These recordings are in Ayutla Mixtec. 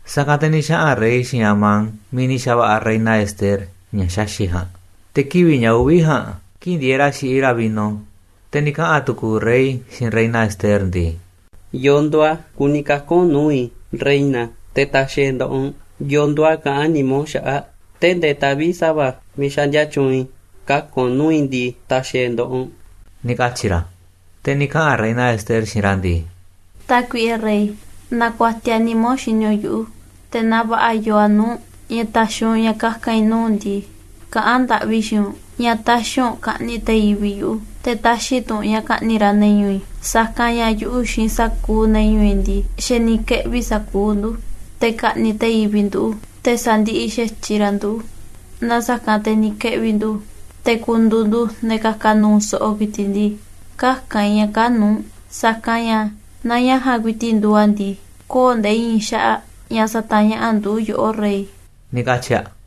Sa̱kanꞌ te̱ ni̱ xaꞌa̱n rey xiinꞌ Amán miiꞌ ni̱ xa̱va̱ꞌa̱ reina Ester ña̱ xaxi̱ꞌ ja̱a̱nꞌ. Te̱ kivi̱ꞌ ña̱ uvi̱ ja̱a̱nꞌ, kii̱ꞌ ndieeꞌ ra̱ xiꞌiꞌ ra̱ vino, te̱ ni̱ kaꞌa̱n tu̱ku̱u̱ rey xiinꞌ reina Ester ndii: ―¿Yo̱o̱ nduuꞌ a̱ kuni kaka̱n u̱nꞌ nuu̱ꞌ i̱, reina, te̱ ta̱xi̱ e̱ꞌ nda̱ꞌaꞌ u̱nꞌ? ¿Yo̱o̱ nduuꞌ a̱ kaꞌán nimá u̱nꞌ xaꞌa̱ꞌ? Tee̱ꞌ ndee taꞌvi̱ꞌ sa̱va̱ miiꞌ xaꞌndia tyuunꞌ i̱ kaka̱n u̱nꞌ nuu̱ꞌ i̱ ndii, ta̱xi̱ i̱ e̱ nda̱ꞌaꞌ u̱nꞌ ―ni̱ katyi̱ ra̱. Te̱ ni̱ kaꞌa̱n reina Ester xiinꞌ ra̱ ndii: ―Tákuiꞌe rey, naaꞌ kuatiaꞌ nimá u̱nꞌ xini u̱nꞌ yuꞌu̱, te̱ naaꞌ va̱ꞌa̱ yoo a̱ nuu̱ꞌ u̱nꞌ ña̱ ta̱xi̱ u̱nꞌ ña̱ kaka̱n i̱ nuu̱ꞌ u̱nꞌ ndii, kaꞌán ndaꞌvi i̱ xiinꞌ u̱nꞌ ña̱ tä̱xi̱ u̱nꞌ ka̱ꞌni̱ꞌ te̱ yivi̱ꞌ yuꞌu̱, te̱ tä̱xi̱ tu̱ u̱nꞌ ña̱ ka̱ꞌni̱ꞌ ra̱ ne̱ ñu̱u̱ i̱. Sa̱kanꞌ ña̱ yuꞌu̱ xiinꞌ sa̱kuuꞌ ne̱ ñu̱u̱ i̱ ndii, xa̱ ni̱ keꞌvi̱ sa̱kuuꞌ ndu̱, te̱ ka̱ꞌni̱ꞌ te̱ yivi̱ꞌ ndu̱, te̱ sa̱ndiꞌiꞌ xa̱tyiꞌ ra̱ nduꞌu̱. Naaꞌ sa̱kanꞌ te̱ ni̱ keꞌvi̱ ndu̱ te̱ ku̱ndu̱u̱ ndu̱ ne̱ ka̱ka̱ nu̱u̱ so̱ꞌo̱ ku̱i̱ti̱ꞌ ndii, käka̱n i̱ ña̱ kaa̱ꞌ nuu̱ꞌ u̱nꞌ. Sa̱kanꞌ ña̱ naaꞌ ña̱ ja̱a̱nꞌ ku̱i̱ti̱ꞌ nduuꞌ a̱ ndii, köo̱ꞌ nde̱e̱ i̱i̱n xaꞌa̱ꞌ ña̱ sa̱ta̱ñaꞌa̱ꞌ ndu̱ yoꞌó, rey ―ni̱ katyi̱ aꞌ.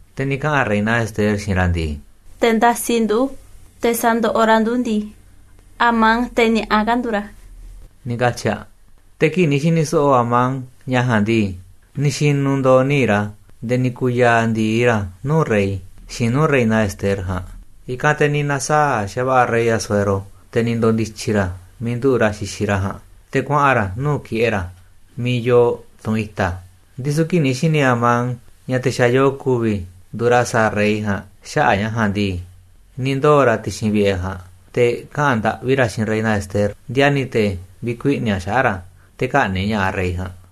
Te̱ ni̱ kaꞌa̱n reina Ester xiinꞌ ra̱ ndii: ―Te̱ ndasiꞌ ndu̱, te̱ sandoꞌoꞌ ra̱ ndu̱ ndii, Amán, te̱ ni̱a̱ꞌa kaa̱ꞌ nduuꞌ ra̱ ―ni̱ katyi̱ aꞌ. Te̱ kii̱ꞌ ni̱ xi̱ni̱ so̱ꞌo̱ Amán ña̱ ja̱a̱nꞌ ndii, ni̱ xi̱nu̱ ndo̱o̱ níiꞌ ra̱ nde̱e̱ ni̱ ku̱u̱ ya̱a̱ ndi̱i ra̱ nuu̱ꞌ rey, xiinꞌ nuu̱ꞌ reina Ester ja̱a̱nꞌ. I̱kanꞌ te̱ ni̱ na̱saa̱ꞌ xa̱va̱ꞌa̱ rey Asuero, te̱ ni̱ ndo̱ndi̱tyi̱ ra̱ miiꞌ nduꞌu̱ꞌ ra̱ xixiꞌ ra̱ ja̱a̱nꞌ, te̱ kuaꞌa̱n ra̱ nuu̱ꞌ ki̱ꞌe̱ ra̱ miiꞌ yoo tunꞌ i̱ta̱. Ndisu̱ kii̱ꞌ ni̱ xi̱ni̱ Amán ña̱ te̱ xa̱ yo̱o̱ ku̱vi̱ nduuꞌ ra̱ sa̱a̱ rey ja̱a̱nꞌ xaꞌa̱ꞌ ña̱ ja̱a̱nꞌ ndii, ni̱ ndoo̱ ra̱ ti̱xi̱n vi̱ꞌe̱ ja̱a̱nꞌ te̱ kaꞌa̱n ndaꞌvi ra̱ xiinꞌ reina Ester, ndiani̱ te̱ vi̱kuiꞌni̱ aꞌ xaꞌa̱ꞌ ra̱ te̱ kä̱ꞌni̱ꞌ ña̱ꞌaꞌ rey ja̱a̱nꞌ.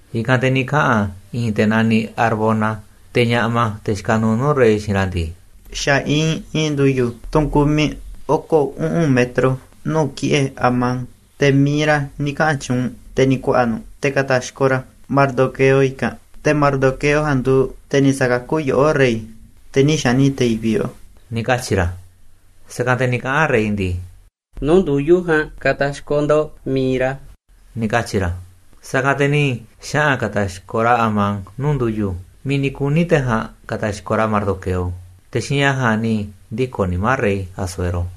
I̱kanꞌ te̱ ni̱ kaꞌa̱n i̱i̱n te̱ naniꞌ Harbona, te̱ ñaꞌma, te̱ xikaꞌ nuuꞌ nuu̱ꞌ rey xiinꞌ ra̱ ndii: ―Xa̱ iinꞌ i̱i̱n ndu̱yu̱, tunꞌ kumiꞌ oko̱ uꞌu̱n metro nuu̱ꞌ ki̱ꞌe̱ Amán. Te̱ mi̱iꞌ ra̱ ni̱ kaꞌa̱n tyuunꞌ, te̱ ni̱ ku̱a̱ꞌa̱ nu̱ꞌ te̱ ka̱ta̱xkoꞌ ra̱ Mardoqueo i̱kanꞌ. Te̱ Mardoqueo ja̱a̱nꞌ nduuꞌ te̱ ni̱ sa̱kakú yoꞌó, rey, te̱ nï̱ xa̱ꞌni̱ꞌ te̱ yivi̱ꞌ yoꞌó ―ni̱ katyi̱ ra̱. Sa̱kanꞌ te̱ ni̱ kaꞌa̱n rey ndii: ―Nuu̱ꞌ ndu̱yu̱ ja̱a̱nꞌ ka̱ta̱xkoꞌ ndo̱ꞌ mi̱iꞌ ra̱ ―ni̱ katyi̱ ra̱. Sa̱kanꞌ te̱ ni̱ xaꞌa̱n ka̱ta̱xkoꞌ ra̱ Amán nuu̱ꞌ ndu̱yu̱, miiꞌ ni̱ kuni̱ te̱ ja̱a̱nꞌ ka̱ta̱xkoꞌ ra̱ Mardoqueo. Te̱ xiinꞌ ña̱ ja̱a̱nꞌ ni̱ ndiko̱ nimá rey Asuero.